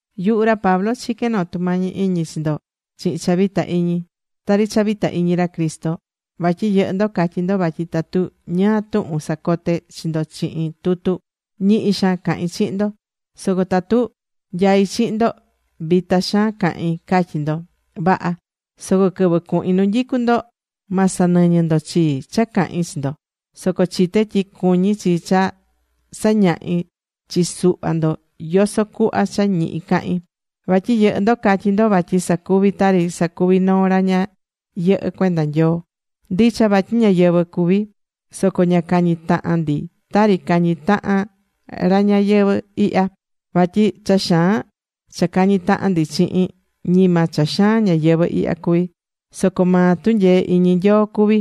Yuhu ra Pablo chiquén noo tumañi iñi chi ndo chihin cha vita iñi. Tari cha vita iñi ra Cristo. Vatyi yɨhɨ́ ndo catyí ndo vatyi tatu ñáá tuhun sacoté chi ndo chihin tutu, ñihi xaan cahín chihin ndo. Soco tatu nyaí chihin ndo, vita xaan cahín, catyí ndo. Vaha. Soco quɨvɨ cuhin nu nyicú ndo, ma sanɨñɨ ndo chii cha cahin chi ndo. Soco chité tyi cuñí chi cha sañahí chi suhva ndo yoso cuhva cha ñihi cahín. Vatyi yɨhɨ́ ndo catyí ndo vatyi sacuví tari sacuví noo ra ña yɨhɨ́ cuenda Nyoo. Ndicha vatyi ñáyɨvɨ cuví ndi. Soco ña cañí tahan ndi tari cañí tahan ra ñayɨvɨ̱ ihya. Vatyi cha xaan cha cañí tahan ndi chihin, ñima cha xaan ñayɨvɨ̱ ihya cuví. Soco maa tunyee iñi Nyoo cuví,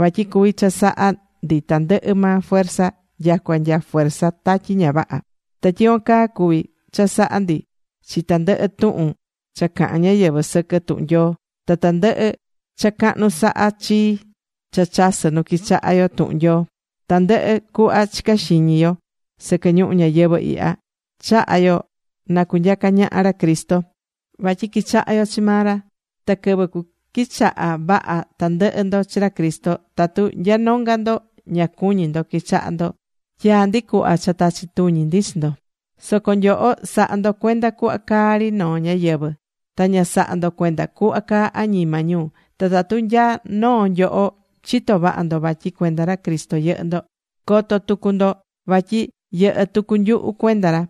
vatyi cuví chasaha ndi tandɨhɨ maa fuerza nyacua nya fuerza tatyi ña vaha. Ta tyicuan caa cuví chasaha ndi chi tandɨhɨ tuhun cha cahán ñáyɨvɨ sɨquɨ tuhun Nyoo, ta tandɨhɨ cha cahnu sahá chii cha chasɨ nu quichahá yo tuhun Nyoo. Tandɨhɨ cuhva chicá xiñi yo sɨquɨ ñuhu ñayɨvɨ̱ ihya, chahá yo na cunyaca ñaha ra Cristo vatyi quichahá yo chi maa ra. Ta quɨvɨ cuquichaha vaha tandɨhɨ ndo chi ra Cristo, tatu nya nonga ndo ña cuñí ndo quichahá ndo, tyaá ndi cuhva cha tachi tuñi ndi chi ndo. Soco nyoho sahá ndo cuenda cuhva caá ri noo ñáyɨvɨ. Ta ña sahá ndo cuenda cuhva caá añima ñu. Ta tatu nya noo nyoho chitó vaha ndo vatyi cuenda ra Cristo yɨhɨ́ ndo, co̱to tucu ndo vatyi yɨhɨ́ tucu nyuhu cuenda ra.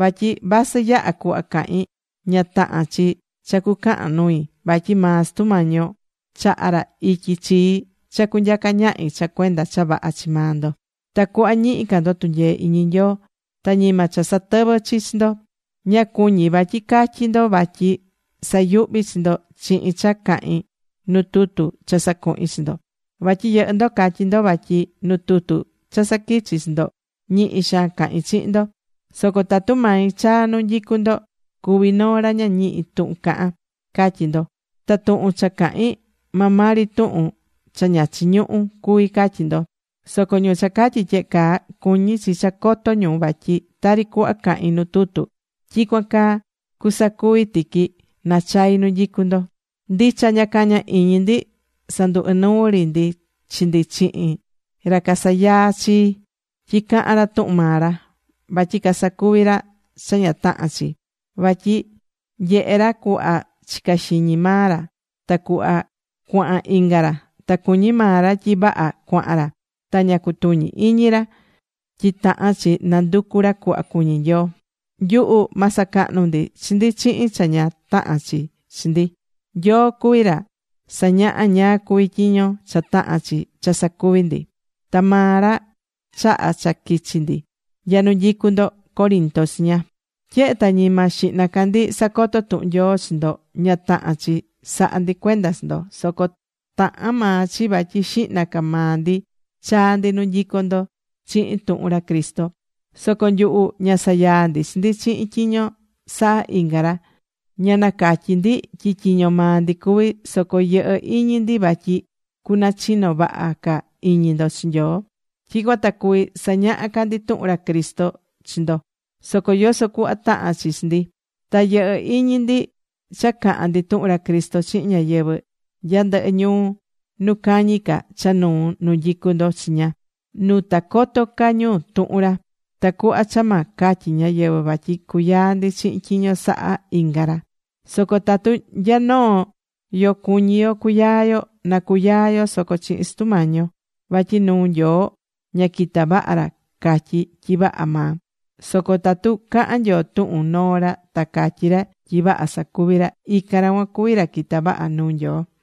Vatyi vasɨ yaha cuhva cahín, ña tahán chi cha cucahan nui. Vatyi maa Sutu Mañi yo chahá ra ityi chii cha cunyaca ñahi cha cuenda cha vaha chi maa ndo, tacuhva ñihi ca ndo tunyee iñi Nyoo. Ta ñima cha satɨví chi ndo. Ña cuñí vatyi catyí ndo vatyi sayuhví chi ndo chihin cha cahín nu tutu cha sacuhín chi ndo. Vatyi yɨhɨ́ ndo catyí ndo vatyi nu tutu cha saquichí chi ndo ñihi xaan cahín chihin ndo. Soco tatu mai chaa nu nyicú ndo cuví noo ra ña ñihí tuhun cahan, catyí ndo. Ta tuhun cha cahín, maa maa ri tuhun cha ña chiñuhú cuví, catyí ndo. Soco ñu cha catyí tyehe caa cuñí chi cha coto ñu vatyi tari cuhva cahín nu tutu, tyicuan caa cusacuvi tiqui nachai nu nyicú ndo. Ndicha ña cañá iñi ndi sandu inuu ri ndi chi ndi chihin ra casayaá chi tyi cahán ra tuhun maa ra. Vatyi casacuví ra cha ña tahán chi. Vatyi nyehé ra cuhva chicá xiñi maa ra ta cuhva cuahan inga ra, ta cuñí maa ra tyi vaha cuahan ra. Ta ña cutuñí iñi ra tyi tahán chi nanducú ra cuhva cuñí Nyoo. Nyuhu ma sacahnu ndi chi ndi chihin cha ña tahán chi chi ndi. Nyoo cuví ra sañahá ñáá cuví tyiño cha tahán chi cha sacuví ndi. Ta maa ra chaha̱ cha quichi ndi nya nu nyicú ndo Corinto chiña. Tyehe ta ñima xihna ca ndi sacoto̱ tuhun Nyoo chi ndo, ña tahán chi sahá ndi cuenda chi ndo. Soco tahán maa chi vatyi xihna ca maa ndi chaa̱ ndi nu nyicú ndo chihin tuhun ra Cristo. Soco nyuhu ña sayaá ndi chi ndi chihin tyiño sahá inga ra. Ña catyí ndi tyi tyiño maa ndi cuví. Soco yɨhɨ́ iñi ndi vatyi cunachino vaha ca iñi ndo chi Nyoo. Tyicuan ta cuví sañaha ca ndi tuhun ra Cristo chi ndo, soco yoso cuhva tahán chi chi ndi. Ta yɨhɨ́ iñi ndi cha cahan ndi tuhun ra Cristo chihin ñáyɨvɨ nya ndɨhɨ ñuu nu cañi ca cha nuu nu nyicú ndo chiña, nu ta coto ca ñu tuhun ra. Tacuhva cha ma catyi ñáyɨvɨ vatyi cuyaa ndi chihin tyiño sahá inga ra. Soco tatu nya noo yoó cuñí yo cuyaa yo, na cuyaa yo soco chihin Sutu Mañi yo. Vatyi nuu Nyoo ña quitá vaha ra catyí tyi vaha maa. Soco tatu cahán Nyoo tuhun noo ra ta catyí ra tyi vaha sacuví ra, ican ra cuan cuví ra quitá vaha nuu Nyoo.